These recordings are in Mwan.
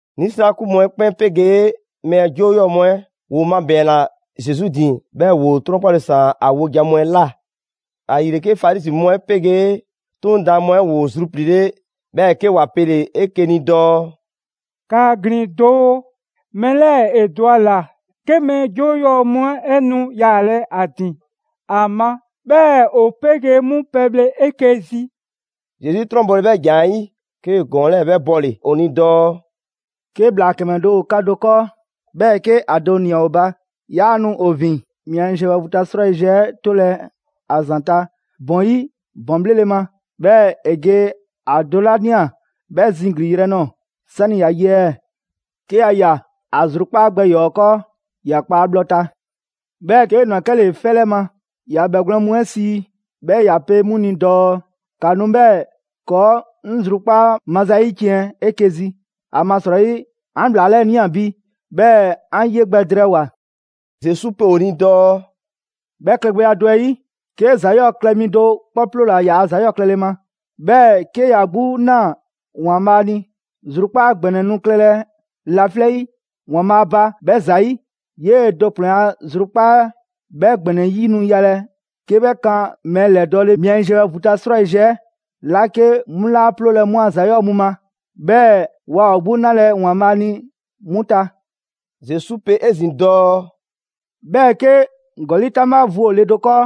'Nisrakun mu 'ɛ 'kpɛn 'pegee mɛɛ 'joo 'yɔɔ‑ mu 'ɛ ‑woo mabɛɛnna Zesu ‑din, 'bhɛɛ‑ ‑woo 'trɔnkpale ‑saan ‑a wojan mu 'ɛ ꞊la. ‑Ayile, 'ke Farizi mu 'ɛ 'pegee 'Toŋ daan mu 'ɛ ‑woo zrupliile', 'bhɛɛ‑ 'ke ‑wa pele‑ 'eke‑ ni dɔɔ: «‑Kaa ‑glin doo, mɛɛ 'lɛɛ‑ ‑e dɔ ‑a ‑la 'ke mɛɛ 'joo 'yɔɔ‑ mu 'ɛ nu yaalɛ ‑a ‑din a ma, 'bhɛɛ‑ ‑o 'pegee 'mu pɛbhle 'eke‑ zi.» Zesu 'trɔnbɔle 'bhɛ ‑jan 'ɛ 'yi, 'kee‑ ‑gɔɔn 'lɛɛ‑ 'bhɛ bɔle‑ ‑o ni dɔɔ: «'Ke ‑bhlaa ‑kɛmɛ do ‑o 'ka do 'kɔɔ, 'bhɛɛ‑ 'ke ‑a do ꞊nia ‑o ba, yaa nu ‑o ‑vin mia yiziɛ bhɛ vu ta 'srwayiziɛ 'ɛ 'tolɛ‑ ‑a ‑zanta' ‑bɔn 'yi ‑bɔn 'bhlele‑ ma, 'bhɛɛ‑ ‑e ge ‑a do 'la 'bhɛ ꞊nia 'bhɛ ziglinyrɛ nɔɔ‑ 'sani‑ ‑ya ye ɛɛ? 'Ke ‑ya ꞊ya, ‑a zrukpaa' gbɛ ‑yɔɔ 'ɛ 'kɔɔ, ‑ya kpa ‑a bhlɔ ta. 'Bhɛɛ‑ 'kee‑ ꞊nwa 'kɛle‑ 'fɛ 'lɛ ma, ‑ya bhɛgwlɛn mu 'ɛ sii 'bhɛ ‑ya pe 'mu ni dɔɔ: ‹‑Ka nu 'bhɛɛ‑ ‑kɔɔ' 'ŋ zrukpaa' maza 'ɛ 'yiciɛn‑ 'eke‑ zi! ‑Amasrɔyi 'an ‑bhlaa 'lɛɛ‑ ꞊nia bi 'bhɛɛ‑ 'an 'ye gbɛ drɛɛwoa‑.›» Zesu pe ‑o ni dɔɔ: «'Bhɛ klɛgbɛya do 'ɛ 'yi, 'ke ‑za 'yɔɔ‑ klɛ mi do 'kpɔ 'ploola‑ ‑za 'yɔɔ‑ klɛle ma, 'bhɛɛ‑ 'ke ‑ya 'gbu ꞊naa ‑Waanbhaa' ni, zrukpaa' ‑gbɛnɛ nu klɛlɛ laflɛ' 'yi ‑Waanbhaa' ba 'bhɛ ‑zayi'; 'yee‑ do ‑kplɛn a zrukpaa' 'ɛ 'bhɛ ‑gbɛnɛ 'yi nu yalɛ 'ke 'bhɛ kan mɛɛ ‑lɛdɔɔle mia yiziɛ bhɛ vu ta 'srwayiziɛ 'la 'ke 'mu laa 'ploolɛ‑ 'mu a ‑za 'yɔɔ‑ mu 'ɛ ma, 'bhɛɛ‑ waa ‑o 'gbu 'nalɛ‑ ‑Waanbhaa' ni 'mu ta.» Zesu pe 'ezin‑ dɔɔ: «'Bhɛɛ‑ 'ke ‑gɔli' 'taŋbha vu ‑o le do 'kɔɔ,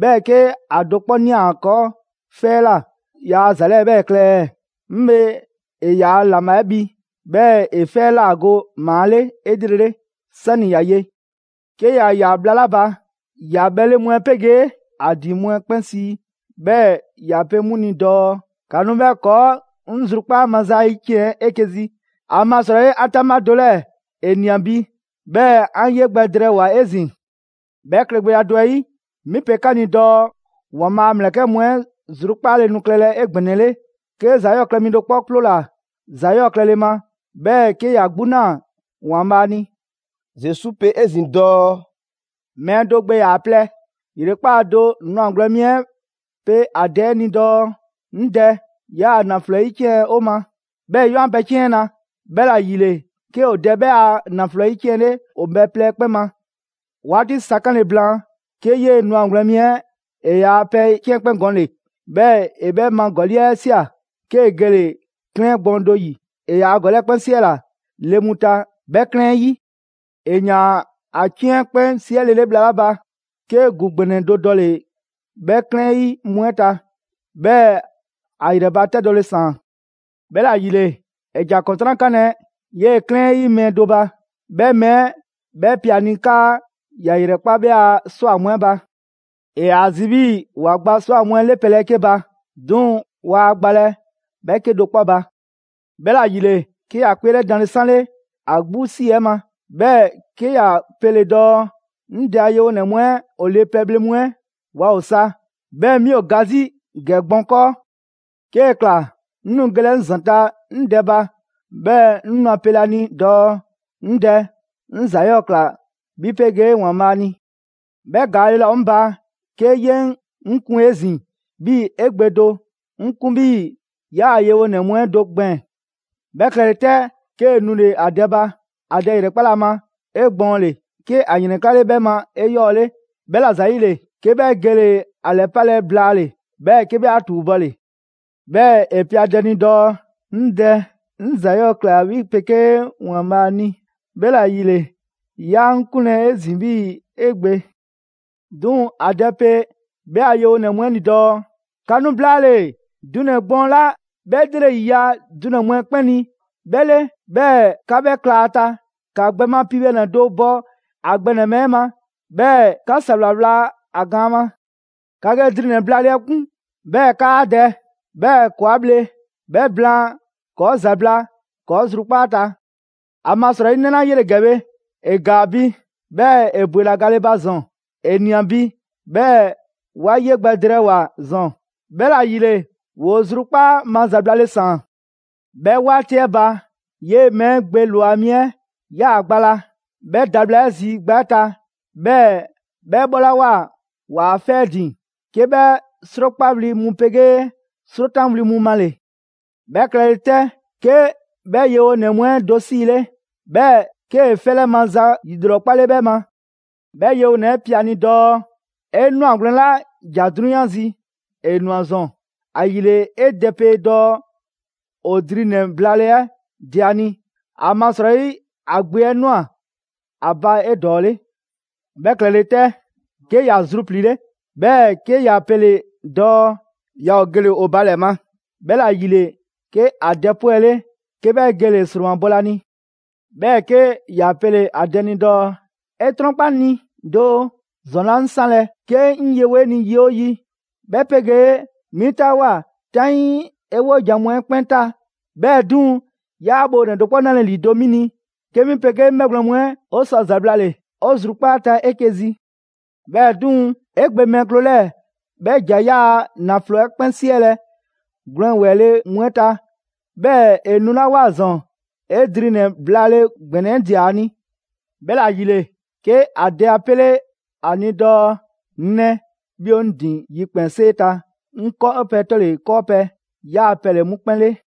'bhɛɛ‑ 'ke ‑a do 'kpɔ ꞊nia ‑a 'kɔɔ 'fɛ 'ɛ ꞊la, yaa ‑za 'lɛɛ‑ 'bhɛɛ‑ klɛ ɛɛ? 'Ŋ bhe ‑e ‑yaa' ‑laŋbha 'ɛ bhi, 'bhɛɛ‑ ‑e 'fɛ 'ɛ ꞊la go ‑maa 'le 'elrele, 'sani‑ ‑ya ye. 'Ke ‑ya ꞊ya bhla 'la ba, ‑ya bhɛle mu 'ɛ 'pegee ‑a ‑din mu 'ɛ 'kpɛn sii, 'bhɛɛ‑ ‑ya pe 'mu ni dɔɔ: ‹‑Ka nu 'bhɛɛ‑ ‑kɔɔ' 'ŋ zrukpaa' maza 'ɛ 'yiciɛn‑ 'eke‑ zi! ‑Amasrɔyi 'an 'taŋbha do 'lɛɛ‑ ‑e ꞊nia bi, 'bhɛɛ‑ 'an ye gbɛ drɛɛwoa‑ 'ezin‑!› 'Bhɛ klɛgbɛya do 'ɛ 'yi, 'mi pe 'ka ni dɔɔ ‑Waanbhaa' a ‑mlɛkɛ' mu 'ɛ zrukpaale nu klɛlɛ 'egbɛnɛle, 'ke ‑za 'yɔɔ klɛ mi do 'kpɔ 'ploola‑ ‑za 'yɔɔ klɛle ma, 'bhɛɛ‑ 'ke ‑ya 'gbu ꞊naa ‑Waanbhaa' ni.» Zesu pe 'ezin‑ dɔɔ: «Mɛɛ do gbe ‑yaa plɛ. ‑Yrekpaa' do, ‑nwagwlɛn' mi 'ɛ pe ‑a dɛ 'ɛ ni dɔɔ: ‹'Ŋ dɛ, 'yaa‑ ‑naflo 'ɛ ‑yiciɛn' 'o ma, 'bhɛɛ‑ 'ye 'an pɛ 'ciɛn 'na.› 'Bhɛla‑ ‑yile 'ke ‑o dɛ 'bhɛ a ‑naflo 'ɛ 'yiciɛnle ‑o mɛɛ plɛ ‑kpɛn ma. 'Waati sa 'kanle‑ blaan, 'ke 'yee‑ ‑nwagwlɛn' mi 'ɛ ‑e ‑yaa' pɛ 'ciɛn 'ɛ 'kpɛn gɔnle‑. 'Bhɛɛ‑ ‑e 'bhɛ ma ‑gɔli' 'ɛ ꞊sia, 'kee‑ gele‑ 'klɛɛn gbɔɔn do ‑yi. ‑E ‑yaa' ‑gɔli' 'ɛ 'kpɛn 'siɛla‑ le mu ta 'bhɛ 'klɛɛn 'ɛ 'yi. ‑E ‑yaan ‑a 'ciɛn 'ɛ 'kpɛn 'siɛlele bhla 'la ba, 'ke ‑gu ‑gbɛnɛ do dɔle‑ 'bhɛ 'klɛɛn 'yi mu 'ɛ ta. 'Bhɛɛ‑ ‑a ‑yrɛbatɛdɔle ‑saan. 'Bhɛla‑ ‑yile, ‑e ‑ja ‑kɔntran' 'kanlɛ‑ 'yee 'klɛɛn 'ɛ 'yi mɛɛ do ba. 'Bhɛ mɛɛ 'ɛ 'bhɛ pe a ni 'kaa ‑ya ‑yrɛkpa' 'bhɛ a ꞊swa mu 'ɛ ba. ‑E ‑yaa zi 'bhii‑ ‑wa gba ꞊swa mu 'ɛ 'le pɛbhle 'ɛ 'ke ba, 'duŋ‑ waa ‑a gbalɛ 'bhɛ 'kedo‑ 'kpɔ ba. 'Bhɛla‑ ‑yile, 'ke ‑ya 'kpeelɛdanle 'sanle ‑a 'gbu 'si 'ɛ ma, 'bhɛɛ‑ 'ke ‑ya pele‑ dɔɔ: ‹'Ŋ dɛ a yewonɛ mu 'ɛ ‑o le pɛbhle mu 'ɛ waa ‑o sa, 'bhɛɛ‑ 'mi ‑o ga 'zi ‑gɛ gbɔn 'kɔɔ! 'Kee‑ ꞊kla, 'ŋ nu gelɛ 'ŋ ‑zanta' 'ŋ dɛ ba, 'bhɛɛ‑ 'ŋ nu ‑a pelɛ ‑a ni dɔɔ: 'Ŋ dɛ, 'ŋ ‑za 'yɔɔ‑ ꞊kla 'bhi 'pegee ‑Waanbhaa' ni. 'Bhɛ ‑gaale' laa ‑o 'ŋ ba 'ke 'ye 'ŋ kun 'ezin‑ 'bhii‑ 'e gbe do. 'Ŋ 'kun 'bhii‑ 'yaa‑ yewonɛ mu 'ɛ do gbɛɛn‑.› 'Bhɛ klɛle 'tɛ, 'kee‑ nule‑ ‑a dɛ ba. ‑A dɛ ‑yrɛkpale ‑a ma 'egbɔɔnle, 'ke ‑a ‑yrɛnklale 'bhɛ ma 'eyɔɔle. 'Bhɛla‑ ‑zayile, 'ke 'bhɛ gele‑ ‑a ‑lɛpalɛ blaale‑, 'bhɛɛ‑ 'ke 'bhɛ 'a ‑tuubɔle. 'Bhɛɛ‑ ‑e pe ‑a dɛ ni dɔɔ: ‹'Ŋ dɛ, 'ŋ ‑za 'yɔɔ‑ ꞊kla 'bhi 'pegee ‑Waanbhaa' ni, 'bhɛla‑ ‑yile, 'yaa 'ŋ 'kunlɛ‑ 'ezin‑ 'bhii‑ 'e gbe.› 'Duŋ‑ ‑a dɛ pe 'bhɛ a yewonɛ mu 'ɛ ni dɔɔ: ‹‑Ka nu blaale‑ dunɛ‑ gbɔɔn 'la 'bhɛ 'lrele‑ ‑yiya' dunɛ‑ mu 'ɛ 'kpɛn ni 'bhɛ 'le, 'bhɛɛ‑ ‑ka 'bhɛ 'kla 'a ta. ‑Ka gbɛ ma piibhɛnɛ do bɔ ‑a gbɛ ‑nɛbhɛ' 'ɛ ma, 'bhɛɛ‑ ‑ka ‑sawla 'wla ‑a gaan ma. ‑Ka ge dri ‑nɛ blaale 'ɛ 'kun, 'bhɛɛ‑ 'kaa dɛ; 'bhɛɛ‑ ‑kɔɔ' 'a bhle. 'Bhɛ blaan, ‑kɔɔ' ‑zabla' ‑kɔɔ' zrukpaa' ta. ‑Amasrɔyi, 'ŋ 'nɛ 'la 'yele‑ ‑gɛ bhe, ‑e ‑gaa bi, 'bhɛɛ‑ ‑e ‑bwela gale ba ‑zɔn; ‑e ꞊nia bi, 'bhɛɛ‑ 'wa 'ye gbɛ drɛɛwoa‑ ‑zɔn.› 'Bhɛla‑ ‑yile ‑woo zrukpaa' ma ‑zablale ‑saan.» «'Bhɛ 'waati 'ɛ ba, 'yee‑ mɛɛ 'ɛ gbe ‑lwa mi 'ɛ 'yaa‑ gba la. 'Bhɛ da bhla 'ɛ zi gba 'ɛ ta, 'bhɛɛ‑ 'bhɛ bhɔlawoa ‑waa' 'fɛ 'ɛ ‑din, 'ke 'bhɛ 'srokpawli mu 'pegee 'srotanwli mu male‑. 'Bhɛ klɛle 'tɛ, 'ke 'bhɛ yewonɛ mu 'ɛ do 'siile, 'bhɛɛ‑ 'kee‑ 'fɛ 'lɛ maza ‑yilrɔkpale 'bhɛ ma. 'Bhɛ yewonɛ 'ɛ pe ‑a ni dɔɔ: ‹'E 'nwagwlɛn‑ 'la ‑ja 'drunyan zi, ‑e ꞊nwa ‑zɔn. ‑Ayile 'e dɛ pe dɔɔ ‑o dri ‑nɛ blaale 'ɛ dɛ ‑a ni. ‑Amasrɔyi ‑a gbe 'ɛ ꞊nwa ‑a ba 'edɔɔle.› 'Bhɛ klɛle 'tɛ, 'ke ‑ya zrupliile, 'bhɛɛ‑ 'ke ‑ya pele‑ dɔɔ yaa ‑o gele‑ ‑o ba ‑lɛ ma. 'Bhɛla‑ ‑yile 'ke a dɛ 'pwɛle, 'ke 'bhɛ gele‑ ‑sromabɔlɛ ‑a ni. 'Bhɛɛ‑ 'ke ‑ya pele‑ ‑a dɛ ni dɔɔ: ‹'E 'trɔnkpa 'ŋ ni doo, ‑zɔn 'laa 'ŋ 'sanlɛ‑ 'ke 'ŋ yewo 'e ni yi 'oo yi, 'bhɛ 'pegee 'mi 'taawoa꞊ 'taŋii 'e 'wojan‑ mu 'ɛ 'kpɛn ta. 'Bhɛɛ‑ 'duŋ‑ 'yaa bhoonɛ‑ do 'kpɔ 'nalɛ‑ ‑lido' 'mi ni 'ke 'mi 'pegee 'ŋ 'bhɛgwlɛn‑ mu 'ɛ 'o sɔ ‑zablale 'o zrukpaa' ta 'eke‑ zi. 'Bhɛɛ‑ 'duŋ‑, 'e gbe mɛɛ kloo 'lɛɛ‑, 'bhɛ ‑ja 'yaa‑ ‑naflo 'ɛ 'kpɛn 'siɛlɛ‑ gwlɛn ‑wɛɛ le mu 'ɛ ta, 'bhɛɛ‑ ‑e nulawoa ‑zɔn, 'e dri ‑nɛ blaale ‑gbɛnɛ 'ɛ ꞊dia ‑a ni.› 'Bhɛla‑ ‑yile, 'ke ‑a dɛ 'a 'pele 'a ni dɔɔ: ‹'Ŋ 'nɛ, 'bhi ‑o 'ŋ ‑din yikpɛnsee ta, 'ŋ 'kɔɔpɛ‑ 'tɔle‑ 'kɔɔpɛ‑ 'yaa‑ pɛ ‑le 'mu 'kpɛn 'le.